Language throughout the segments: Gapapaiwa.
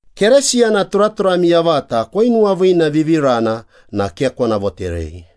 Keresiyana turaturami yavata koinuwaviinavivirana na ke kona voterei.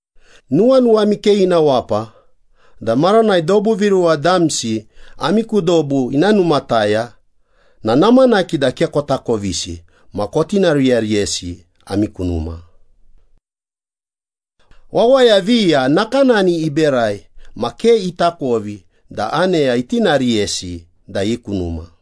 Nuwanuwami ke ina wapa da maranai dobu viruwa damsi ami ku dobu ina numataya na namanaki da ke kotakovisi ma kotitinariyariyesi ami ku numa. Wawaya viya nakanani iberai ma ke itakovi da aneya itinariyesi da i ku numa.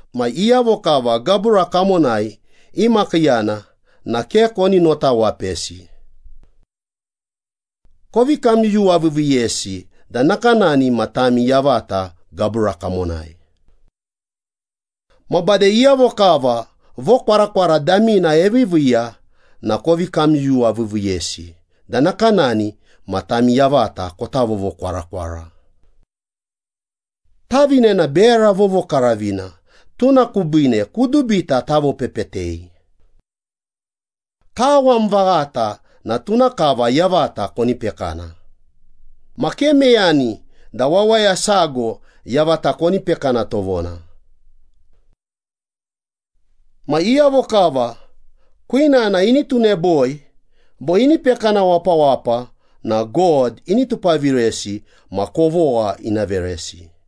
Ma iyavo kava gabura kamonai imakiiyana na ke koni nuwawapesi. Kovi kamyuyuwaviiviiyesi da nakanani ma tami yavata gabura kamonai. Ma bade iyavo kava vokwarakwara damina eviiviiya na kovi kamyuyuwaviiviiyesi da nakanani ma tami yavata kota vovokwarakwara. Tavine na bera vovokaravina, tuna kubiine kudubita tavopepetei. Kawam vaghata na tuna kava yavata koni pekana, ma ke meyani da wawaya sago yavata koni pekana tovona. Ma iyavo kava kwinana ini tuneboi bo ini pekana wapawapa na God ini tupaviresi ma kovogha ina veresi.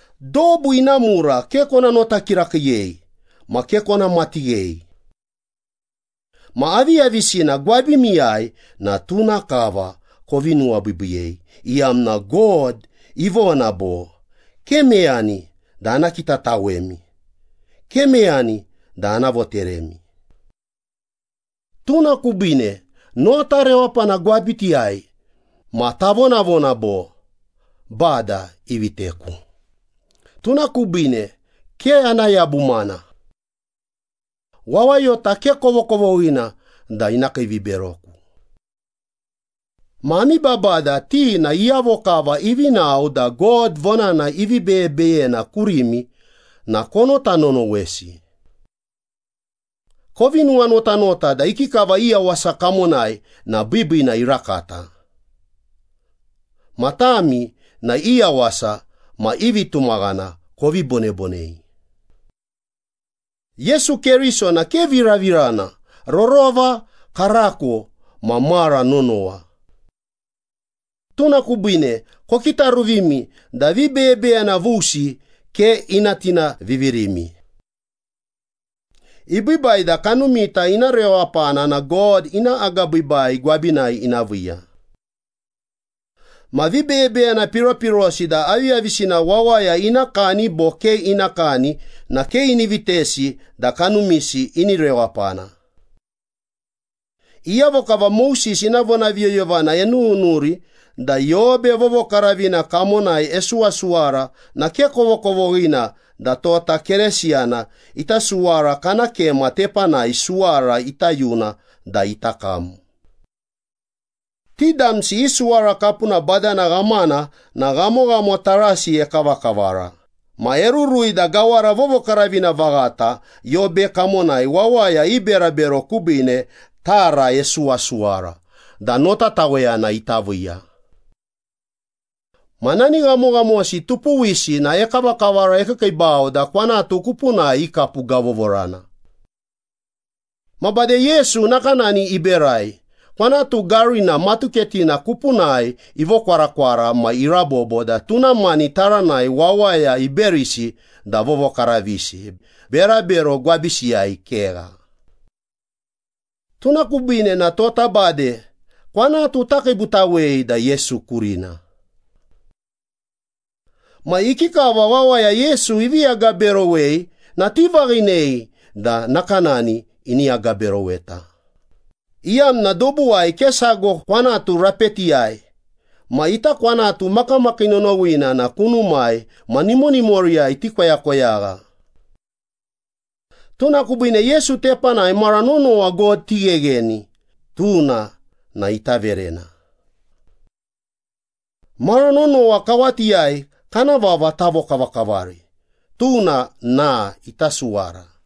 Dobu ina mura ke kona nota kirakiiyei ma ke kona matighei. Ma aviyavisina gwabimiyai na tuna kava kovi nuwabiibiiyei, iyamna God ivona bo, “Ke meyani da ana kitatawemi, ke meyani da ana voteremi.” Tuna kubiine nota rewapana gwabitiyai ma tavonavona bo, “Bada iviteku, tuna kubiine ke ana yabumana. Wawayota ke kovokovoghina da ina kiiviberoku.” Ma ami babada, ti na iyavo kava ivi nao da God vonana ivi beyebeyena kurimi na konota nonowesi. Kovi nuwanotanota da ikikava i yawasa kamonai na biibiina irakata. Ma tami na i yawasa ma i vitumaghana kovi bonebonei. Yesu Keriso na ke viravirana, rorova, karako ma mara nonowa. Tuna kubiine kokitaruvimi da vibeyebeyena vusi ke ina tinaviviremi. Ibiibai da kanumita ina rewapana na God ina agabiibai gwabinai ina viiya. Ma vibeyebeyena piropirosi da aviyavisina wawaya ina kani bo ke ina kani na ke ini vitesi da kanumisi ini rewapana. Iyavo kava Moses ina vonaviyoyovana enununuri da yobe vovokaravina kamonai esuwasuwara na ke kovokovoghina da tota Keresiyana ita suwara kana kema tepanai suwara ita yuna da ita kam. Ti damsi i suwara kapuna badana ghamana na ghamoghamo tarasi ekavakavara, ma erurui da Gawara Vovokaravina Vaghata yobe kamonai wawaya i berabero kubiine tara isuwasuwara da notataweyana ita viiya. Ma nani ghamoghamosi tupuwisi na ekavakavara ekiikiibau da kwanatu kupunai ikapugavovorana. Ma bade Yesu nakanani iberai, kwanatu garina matuketina kupunai ivokwarakwara ma irabobo da tuna mani taranai wawaya iberisi da vovokaravisi, berabero gwabisiyai kegha. Tuna kubiine na tota bade kwanatu takiibutawei da Yesu kurina. Ma ikikava wawaya Yesu ivi agaberowei na tivaghinei da nakanani ini agaberoweta, iyamna dobuwai ke sago kwanatu rapetiyai ma ita kwanatu makamakii nonowina na kunumai ma nimonimoriyai tikoyakoyagha. Tuna kubiine Yesu tepanai mara nonowa God tighegheni, tuna na ita verena. Mara nonowa kawatiyai kana vava tavokavakavari, tuna na ita suwara.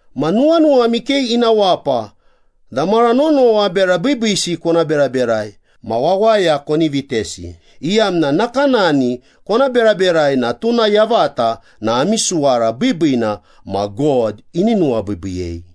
Ma nuwanuwami ke ina wapa da mara nonowa bera biibiisi kona beraberai ma wawaya koni vitesi, iyamna nakanani kona beraberai na tuna yavata na ami suwara biibiina ma God ini nuwabiibiiyei.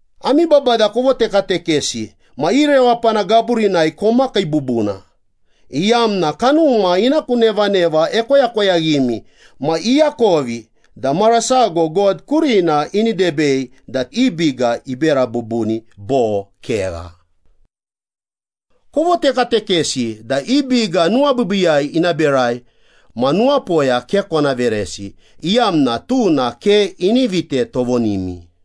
Ami babada kovotekatekesi ma i rewapana gaburinai komakii bubuna, iyamna kanuma ina ku nevaneva ekoyakoyaghimi ma iakovi da mara sago God kurina ini debei da i biga ibera bubuni bo kegha. Kovotekatekesi da i biga nuwabiibiiyai ina berai ma nuwapoya ke kona veresi, iyamna tuna ke ini vite tovonimi.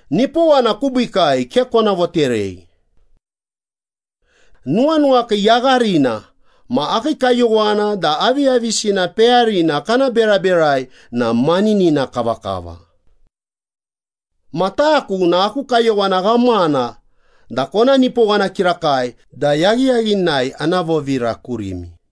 Nipowana kubiikai ke kona voterei. Nuwanuwakii yagharina ma akii kayowana da aviyavisina peyarina kana beraberai na maninina kavakava. Ma taku na aku kayowana ghamana da kona nipowana kirakai da yaghiyaghinai ana vovira kurimi.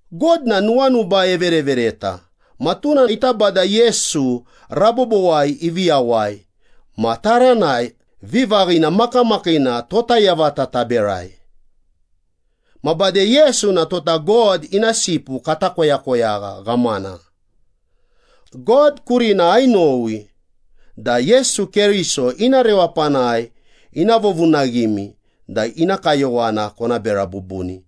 God na nuwanuba everevereta ma tuna ita Bada Yesu rabobowai ivi yawai ma taranai vivaghina makamakiina tota yavata taberai. Ma Bada Yesu na tota God ina sipu kata koyakoyagha ghamana. God kurina ainowi da Yesu Keriso ina rewapanai ina vovunaghimi da ina kayowana kona bera bubuni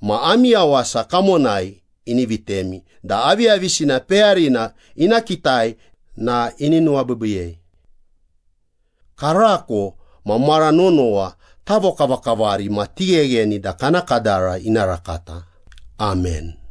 ma ami yawasa kamonai ini vitemi da aviyavisina peyarina ina kitai na ini nuwabiibiiyei. Karako ma mara nonowa tavokavakavari ma tighegheni da kana kadara ina rakata. Amen.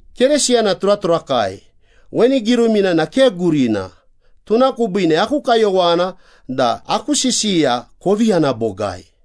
Keresiyana turaturakai, weni girumina na ke gurina, tuna kubiine aku kayowana da aku sisiya kovi yana bogai.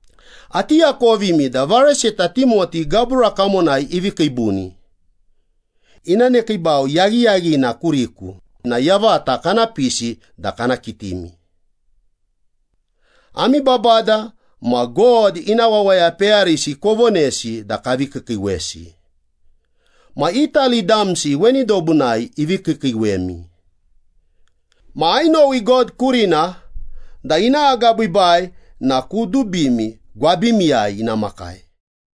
Ati akovimi da varesita Timoti gabura kamonai ivi kiibuni. Ina nekiibau yaghiyaghina kuriku na yavata kana pisi da kana kitimi. Ami babada ma God ina wawaya peyarisi kovonesi da kavi kiikiiwesi. Ma Itali damsi weni dobunai ivi kiikiiwemi. Ma ainowi God kurina da ina agabiibai na kudubimi gwabimiyai ina makai.